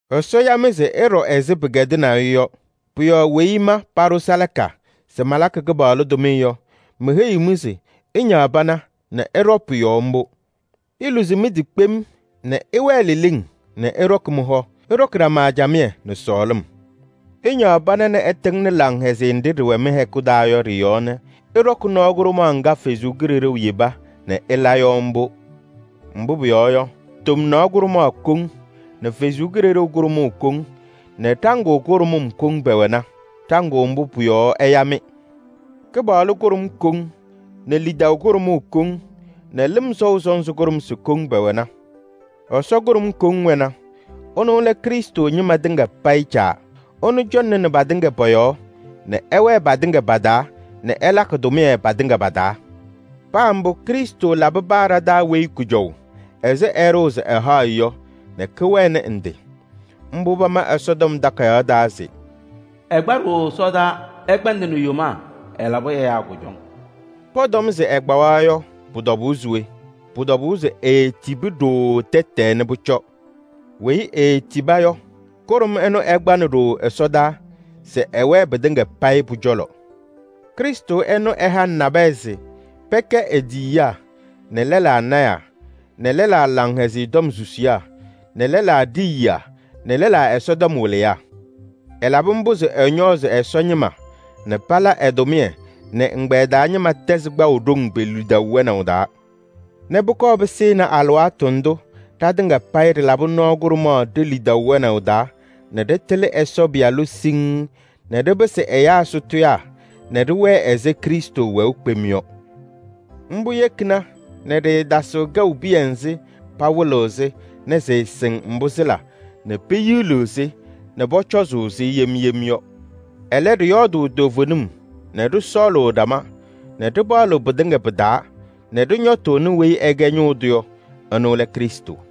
Ɛsɔ ya-mɩ se ɩɖɔ ɛzɩ pɩkɛdɩnaʋ-ɩ yɔ. Pʋ-yɔɔ weyi ma paɖʋ salaka se malakɩ Kɩpaɣlʋ tʋmɩyɛ yɔ, meheyiɣ-mɩ se ɩñaɣ pana nɛ ɩɖɔ pʋ-yɔɔ mbʋ: iluzi mɩ-tɩ kpem nɛ ɩwɛɛ leleŋ nɛ ɩɖɔkɩ mɩ-hɔ. Ɩɖɔkɩ ɖama camɩyɛ nɛ sɔɔlɩm. Ɩñaɣ pana nɛ ɩtɩŋnɩ laŋhɛzɩyɛ nɖɩ ɖɩwɛ mɩ-hɛkʋ taa yɔ ɖɩ-yɔɔ nɛ ɩɖɔkɩ nɔɔ kʋɖʋmaɣ ŋga Ɛsɔ Kalɩzaɣ yeba nɛ ɩla yɔ mbʋ. Mbʋ pʋyɔɔ yɔ, tomnaɣ kʋɖʋmaɣ koŋ nɛ Ɛsɔ Kalɩzaɣ kʋɖʋmaɣ koŋ nɛ ɖaŋʋʋ kʋɖʋmʋm koŋ pɛwɛna. Ɖaŋʋʋ mbʋ pʋ-yɔɔ ɛya-mɩ. Kɩpaɣlʋ kʋɖʋm koŋ nɛ lidaʋ kʋɖʋmʋʋ koŋ nɛ lɩm sɔʋ sɔnzɩ kʋɖʋmsɩ koŋ pɛwɛna. Ɛsɔ kʋɖʋm koŋ wɛna: ɛnʋ lɛ Krɩstʋ ñɩma tɩŋa payɩ Caa. Ɛnʋ cɔŋnɩnɩ patɩŋa pɔ-yɔɔ nɛ ɛwɛɛ patɩŋa pa-taa nɛ ɛlakɩ tʋmɩyɛ patɩŋa pa-taa. Paa mbʋ, Krɩstʋ labɩ paa ɖa-taa weyi kʋjɔʋ ɛzɩ ɛɖʋʋ se ɛhaɣ-ɩ yɔ nɛ kɩwɛnɩ ndɩ. Mbʋ pama Ɛsɔtɔm Takayaɣ taa se: “Ɛkpa ɖooo ɛsɔdaa, ɛkpɛndɩnɩ yomaa, ɛlabɩ ɛyaa kʋjɔŋ.” Pɔtɔm se ɛkpawa yɔ, pʋ-tɔbʋʋ se we? Pʋ-tɔbʋʋ se eetibi ɖooo tɛtɛɛ nɛ pʋcɔ. Weyi eetiba yɔ, kʋɖʋm ɛnʋ ɛkpanɩ ɖooo ɛsɔdaa se ɛwɛɛ pɩtɩŋa payɩ pʋ-cɔlɔ. Krɩstʋ ɛnʋ ɛhanɩ nabɛyɛ se pɛkɛ e-tiyiyaa nɛ lɛlaa lɔɔyɩsɩ tɩnaa nɛ lɛlaa Laŋhɛzɩyɛ Tɔm susiyaa nɛ lɛlaa ɖiyiyaa nɛ lɛlaa Ɛsɔtɔm wɩlɩyaa. Ɛlabɩ mbʋ se ɛñɔɔzɩ Ɛsɔ ñɩma nɛ pala ɛ-tʋmɩyɛ nɛ ɛgbɛyɛ taa ñɩma tɛzɩ kpaʋ ɖoŋ pe-lidaʋ wɛnaʋ taa nɛ pʋkɔɔ pɩsɩnɩ alɩwaatʋ ndʋ ɖatɩŋa payɩ ɖɩlabɩ nɔɔ kʋɖʋmaɣ ɖe-lidaʋ wɛnaʋ taa nɛ ɖɩtɩlɩ Ɛsɔ Pɩyalʋ siŋŋ nɛ ɖɩpɩsɩ ɛyaa sʋtʋyaa nɛ ɖɩwɛɛ ɛzɩ Krɩstʋ wɛʋ kpem yɔ. Mbʋ yekina nɛ ɖɩɩtasɩɣ kɛʋ piya nzɩ pawɩlɩɣ-sɩ nɛ sɩɩsɩŋ mbʋ sɩla nɛ peyiliɣ-sɩ nɛ pʋcɔzʋʋ-sɩ yem yem yɔ. Ɛlɛ, ɖɩyɔɔdʋʋ toovenim nɛ ɖɩsɔɔlʋʋ ɖama nɛ ɖɩpaɣlɩɣ pɩtɩŋa pɩ-taa nɛ ɖɩñɔtʋʋnɩ weyi ɛkɛ ñʋʋ tʋ yɔ, ɛnʋ lɛ Krɩstʋ.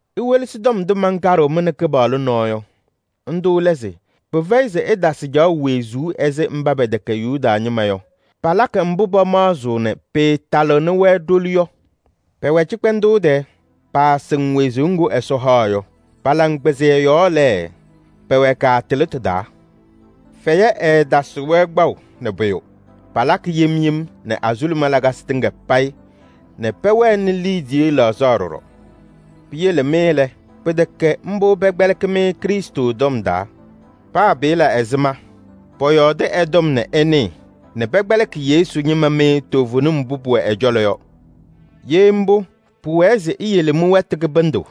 Iwelesi tɔm ndʋ mankaɖɩɣ-mɩ nɛ Kɩpaɣlʋ nɔɔ yɔ. Ndʋ lɛ se: pɩfɛyɩ se ɩtasɩ caɣʋ wezuu ɛzɩ mba pɛtɛkɛ Yuda ñɩma yɔ. Palakɩ mbʋ pamaɣzɩɣ nɛ pɩɩtalɩɣnɩ-wɛ ɖoli yɔ. Pɛwɛ cɩkpɛndʋʋ tɛɛ, paasɩŋ wezuu ŋgʋ Ɛsɔ haɣ yɔ, pa-laŋkpɩzɩyɛ yɔɔ lɛ, pɛwɛ kaatɩlɩtʋ taa. Fɛyɛ ɛɛtasɩɣ-wɛ kpaʋ nɛ pʋyʋ, palakɩ yem yem nɛ azuluma lakasɩ tɩŋa payɩ nɛ pɛwɛnɩ liidiye laɣzaɣ ɖɔɖɔ. Piyele mɩ lɛ, pɩtɛkɛ mbʋ pɛkpɛlɩkɩ-mɩ Krɩstʋ tɔm taa. Paa pɩlabɩ ɛzɩma, pɔyɔɔdɩ ɛ-tɔm nɛ ɩnɩɩ nɛ pɛkpɛlɩkɩ Yesu ñɩma mɩ toovenim mbʋ pʋwɛ ɛ-cɔlɔ yɔ. Ye mbʋ, pʋwɛɛ se iyele mɩ-wɛtʋ kɩbɩndʋ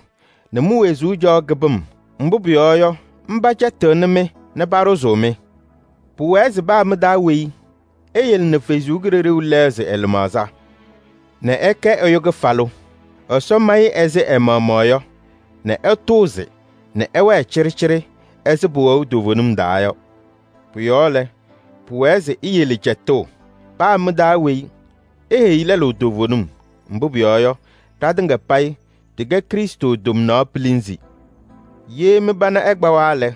nɛ mi-wezuu caɣʋ kɩbɩm, mbʋ pʋyɔɔ yɔ, mba cɛtɩɣnɩ-mɩ nɛ paɖʋzʋʋ-mɩ. Pʋwɛɛ se paa mɩ-taa weyi eyele nɛ Ɛsɔ Kalɩzaɣ lɛɣzɩ ɛ-lɩmaɣza nɛ ɛkɛ ɛyʋ kɩfalʋ. Ɛsɔ ma-ɩ ɛzɩ ɛ-maɣmaɣ yɔ nɛ ɛtʋʋzɩ nɛ ɛwɛɛ cɩɖɩcɩɖɩ ɛzɩ pɩwɛʋ toovenim taa yɔ. Pʋ-yɔɔ lɛ, pʋwɛɛ se iyele cɛtʋʋ: paa mɩ-taa weyi eheyi lɛlʋ toovenim. Mbʋ pʋyɔɔ yɔ, ɖatɩŋa payɩ ɖɩkɛ Krɩstʋ tomnaɣ pilinzi. Ye mɩ-pana ɛkpawa lɛ,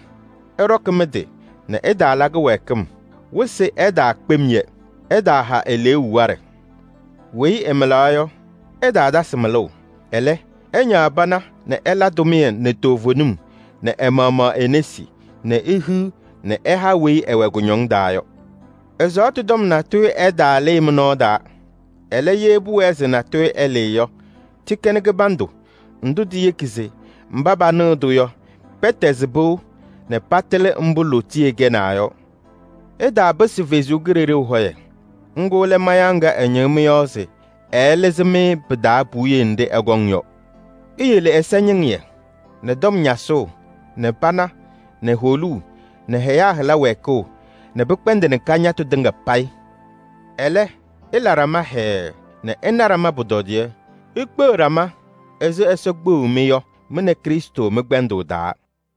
ɩɖɔkɩ mɩ-tɩ nɛ ɩtaala kɩwɛɛkɩm, wɩsɩ ɛtaakpem-yɛ. Ɩtaaha eleeu waɖɛ. Weyi ɛmɩlaɣ yɔ, ɛtaatasɩ mɩlʋʋ. Ɛlɛ, ɛñaɣ pana nɛ ɛla tʋmɩyɛ nɛ toovenim nɛ ɛ-maɣmaɣ e-nesi nɛ ehiɣ nɛ ɛha weyi ɛwɛ kɩcɛyɩm taa yɔ. Ɛzaɣtʋ tɔm natʋyʋ ɛtaalɩɩ mɩ-nɔɔ taa. Ɛlɛ, ye pʋwɛɛ se natʋyʋ ɛlɩɩ yɔ, tɩkɛnɩ kɩbandʋ ndʋ tiyeki se mba panɩɣ-tʋ yɔ, pɛtɛzɩ pɩʋ nɛ patɩlɩ mbʋ lootiye kɛnaa yɔ. Ɩtaapɩsɩ Ɛsɔ Kalɩzaɣ hɔyɛ, ŋga lɛ mayaɣ ŋga ɛñɩɣ mɩ-yɔɔ se ɛɛlɩzɩ-mɩ pɩ-taa puwiye nɖɩ ɛkɔŋ yɔ. Iyele ɛzɩñɩŋɩyɛ nɛ tɔm ñasʋʋ nɛ pana nɛ holuu nɛ ɛyaa hɩla wɛɛkʋʋ nɛ pɩkpɛndɩnɩ kañatʋ tɩŋa payɩ. Ɛlɛ, ɩla ɖama hɛɛɛ nɛ ɩna ɖama pʋtɔdɩyɛ. Ikpeɣ ɖama ɛzɩ Ɛsɔ kpeɣu-mɩ yɔ, mɩ nɛ Krɩstʋ mɩ-kpɛndʋʋ taa.